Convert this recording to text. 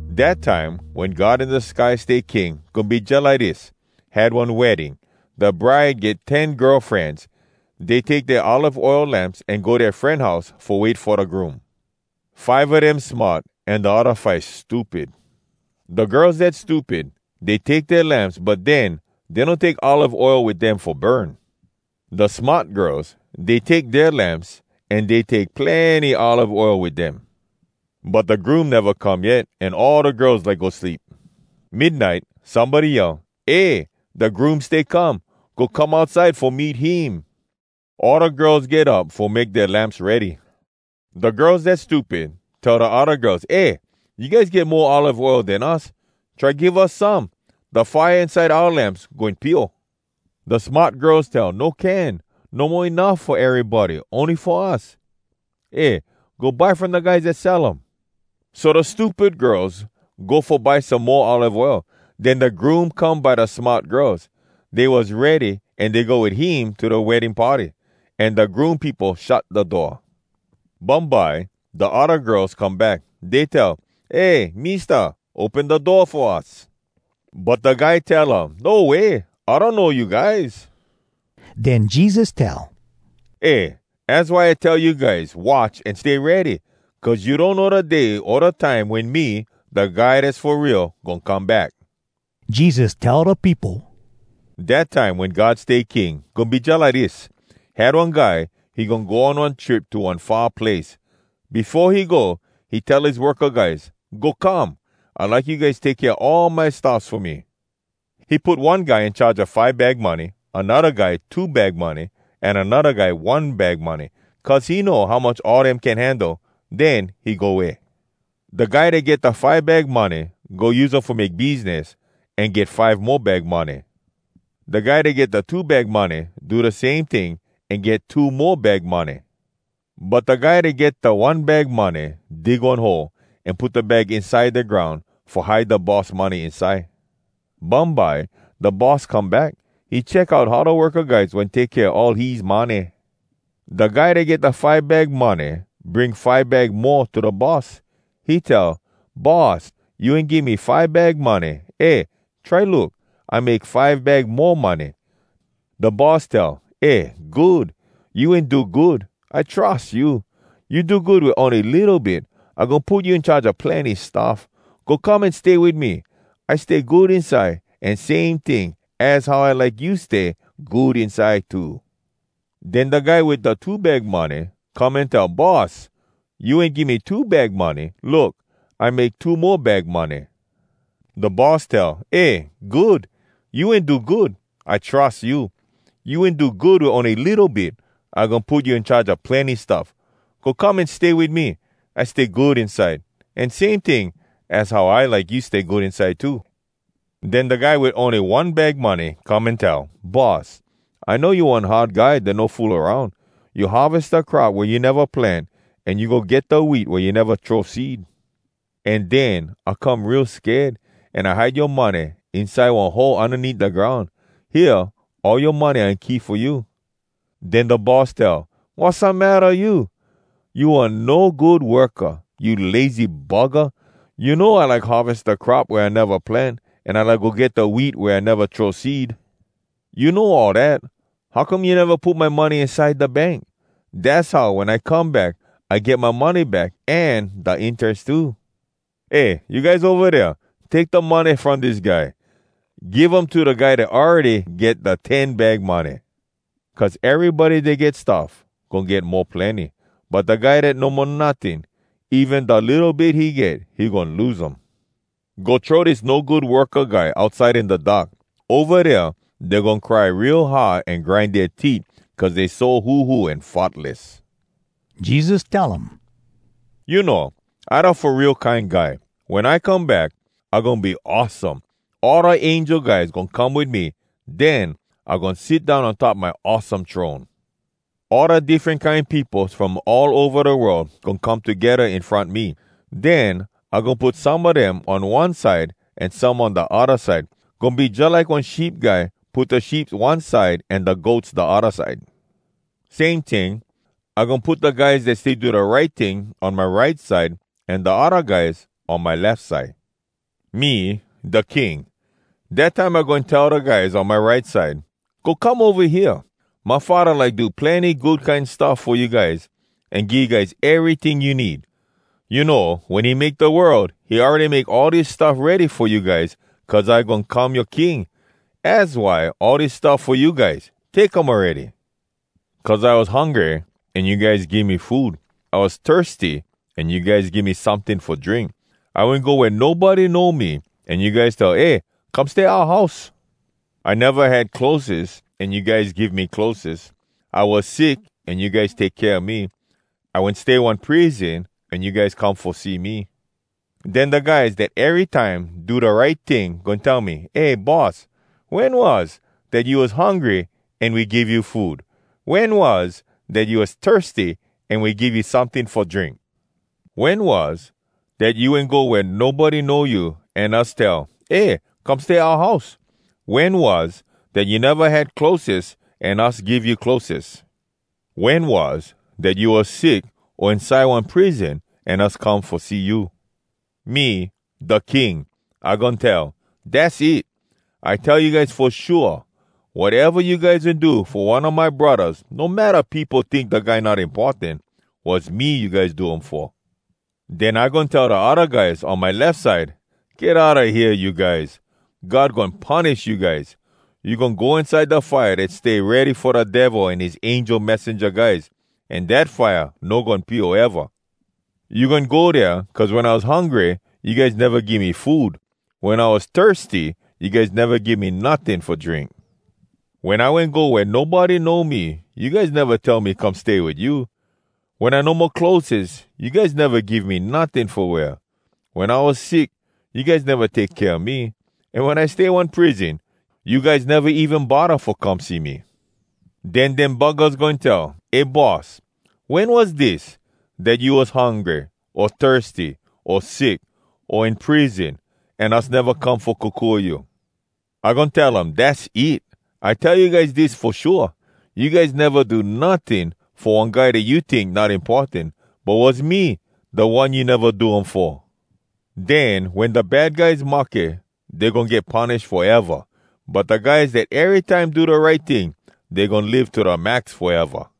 “Dat time, wen God in da sky stay King, goin be jalike dis: Had one wedding. Da bride get ten girl frenz. Dey take dea olive oil lamps an go dea fren house fo wait fo da groom. Five a dem smart, an da odda five stupid. Da girls dat stupid, dey take dea lamps, but den, dey no take olive oil wit dem fo burn. Da smart girls, dey take dea lamps, an dey take plenny olive oil wit dem. But da groom neva come yet, an all da girls like go sleep. Midnite, somebody yell, ‘Eh! Da groom stay come! Go come outside fo meet him!’ “All da girls get up fo make dea lamps ready. Da girls dat stupid tell da odda girls, ‘Eh, you guys get mo olive oil den us. Try give us some! Da fire inside oua lamps, goin pio.’ “Da smart girls tell, ‘No can! No mo enuff fo erybody, ony fo us. Eh, go buy from da guys dat sell um.’ So da stupid girls go fo buy some mo olive oil. Den da groom come by da smart girls. Dey was ready, an dey go wit him to da wedding party. An da groom peopo shut da door. “Bumbye, da odda girls come back. Dey tell, ‘Eh, Mista, open da door fo us!’ “But da guy tell um, ‘No way! I donno you guys.’” Den Jesus tell, “Eh! Az why I stay tell you guys, watch an stay ready! Cuz you donno da day o da time, wen me, da Guy Dass Fo Real, goin come back!” Jesus tell da peopo, “Dat time wen God stay king, goin be jalike dis: Had one guy, he goin go on one trip to one far place. Befo he go, he tell his worka guys, ‘Go come. I like you guys take kea all my stuffs fo me.’ He put one guy in charge a five bag money, anodda guy two bag money, an anodda guy one bag money, cuz he know how much all dem can handle. Den he go way. “Da guy dat get da five bag money go use um fo make biznis, an get five mo bag money. Da guy dat get da two bag money do da same ting, an get two mo bag money. But da guy dat get da one bag money dig one hole, an put da bag inside da groun, fo hide da boss money inside. “Bumbye, da boss come back. He check out how da worka guys wen take kea all his money. Da guy dat get da five bag money bring five bag mo to da boss. He tell, ‘Boss, you wen give me five bag money. Eh, try look! I make five bag mo money.’ “Da boss tell, ‘Eh good! You wen do good. I trus you. You do good wit ony litto bit. I goin put you in charge a plenny stuff. Go come an stay wit me. I stay good inside, an same ting, az how I like you stay good inside too.’ “Den da guy wit da two bag money come an tell, ‘Boss, you wen give me two bag money. Look, I make two mo bag money.’ “Da boss tell, ‘Eh good! You wen do good. I trus you. You wen do good wit ony litto bit. I goin put you in charge a plenny stuff. Go come an stay wit me. I stay good inside, an same ting, az how I like you stay good inside too.’ “Den da guy wit ony one bag money come an tell, ‘Boss, I know you one hard guy dat no fool aroun. You harves da crop wea you neva plant, an you go get da wheat wea you neva throw seed. An den, I come real sked, an I hide yoa money inside one hole undaneat da groun. Hea, all yoa money I wen keep fo you.’ “Den da boss tell, ‘Wassamatta you?! You one no good worka! You lazy buggah! You know I like harves da crop wea I neva plant, an I like go get da wheat wea I neva throw seed. You know all dat! How come you neva put my money inside da bank?! Dass how wen I come back, I get my money back, an da interes too! Eh, you guys ova dea, take da money from dis guy! Give um to da guy dat awready get da ten bag money.’ “Cuz erybody dat get stuff goin get mo plenny. But da guy dat no mo notting, even da litto bit he get, he goin lose um. Go throw dis no good worka guy outside in da dark. Ova dea dey goin cry real hard an grind dea teet cuz dey so huhu an futless.” Jesus tell um, “You know, I da Fo Real Kine Guy. Wen I come back, I goin be awesome. All da angel guys goin come wit me. Den I goin sit down on top my awesome throne. All da diffren kine peopos from all ova da world goin come togedda in front me. Den I goin put some a dem on one side an some on da odda side. Goin be jalike one sheep guy put da sheeps one side an da goats da odda side. Same ting, I goin put da guys dat stay do da right ting on my right side, an da odda guys on my lef side. “Me, da King. Dat time I goin tell da guys on my right side, ‘Go come ova hea! My Faddah like do plenny good kine stuff fo you guys, an give you guys eryting you need. You know, wen he make da world, he awready make all dis stuff ready fo you guys, cuz I goin come yoa King. Az why all dis stuff fo you guys! Take um awready.’ Cuz I was hungry an you guys give me food. I was thirsty an you guys give me someting fo drink. I wen go wea nobody know me, an you guys tell, ‘Eh, come stay oua house.’ I neva had clotheses, an you guys give me clotheses. I was sick an you guys take kea me. I wen stay one prison an you guys come fo see me. “Den da guys dat erytime do da right ting goin tell me, ‘Eh Boss! Wen was, dat you was hungry an we give you food? Wen was, dat you was thirsty an we give you someting fo drink? Wen was, dat you wen go wea nobody know you, an us tell, “Eh, come stay oua house”? Wen was, dat you neva had clotheses, an us give you clotheses? Wen was, dat you was sick o inside one prison, an us come fo see you?’ “Me, da King, I goin tell, ‘Dass it! I tell you guys fo shua, wateva you guys wen do fo one a my braddahs, no matta peopo tink da guy not importan, was me you guys do um fo.’ “Den I goin tell da odda guys on my lef side, ‘Get outa hea, you guys! God goin punish you guys! You goin go inside da fire dat stay ready fo da Devil an his angel messenja guys. An dat fire no goin pio eva! You goin go dea cuz wen I was hungry you guys neva give me food. Wen I was thirsty you guys neva give me notting fo drink. Wen I wen go wea nobody know me, you guys neva tell me come stay wit you. Wen I no mo clotheses, you guys neva give me notting fo wear. Wen I was sick, you guys neva take kea me. An wen I stay one prison, you guys neva even bodda fo come see me.’ “Den dem buggahs goin tell, ‘Eh Boss! Wen was dis, dat you was hungry, o thirsty, o sick, o in prison, an us neva come fo kokua you?’ “I goin tell um, ‘Dass it! I tell you guys dis fo shua: You guys neva do notting fo one guy dat you tink not importan. But was me, da one you neva do um fo!’ “Den wen da bad guys mahke, dey goin get punish foeva! But da guys dat erytime do da right ting, dey goin live to da max foeva!”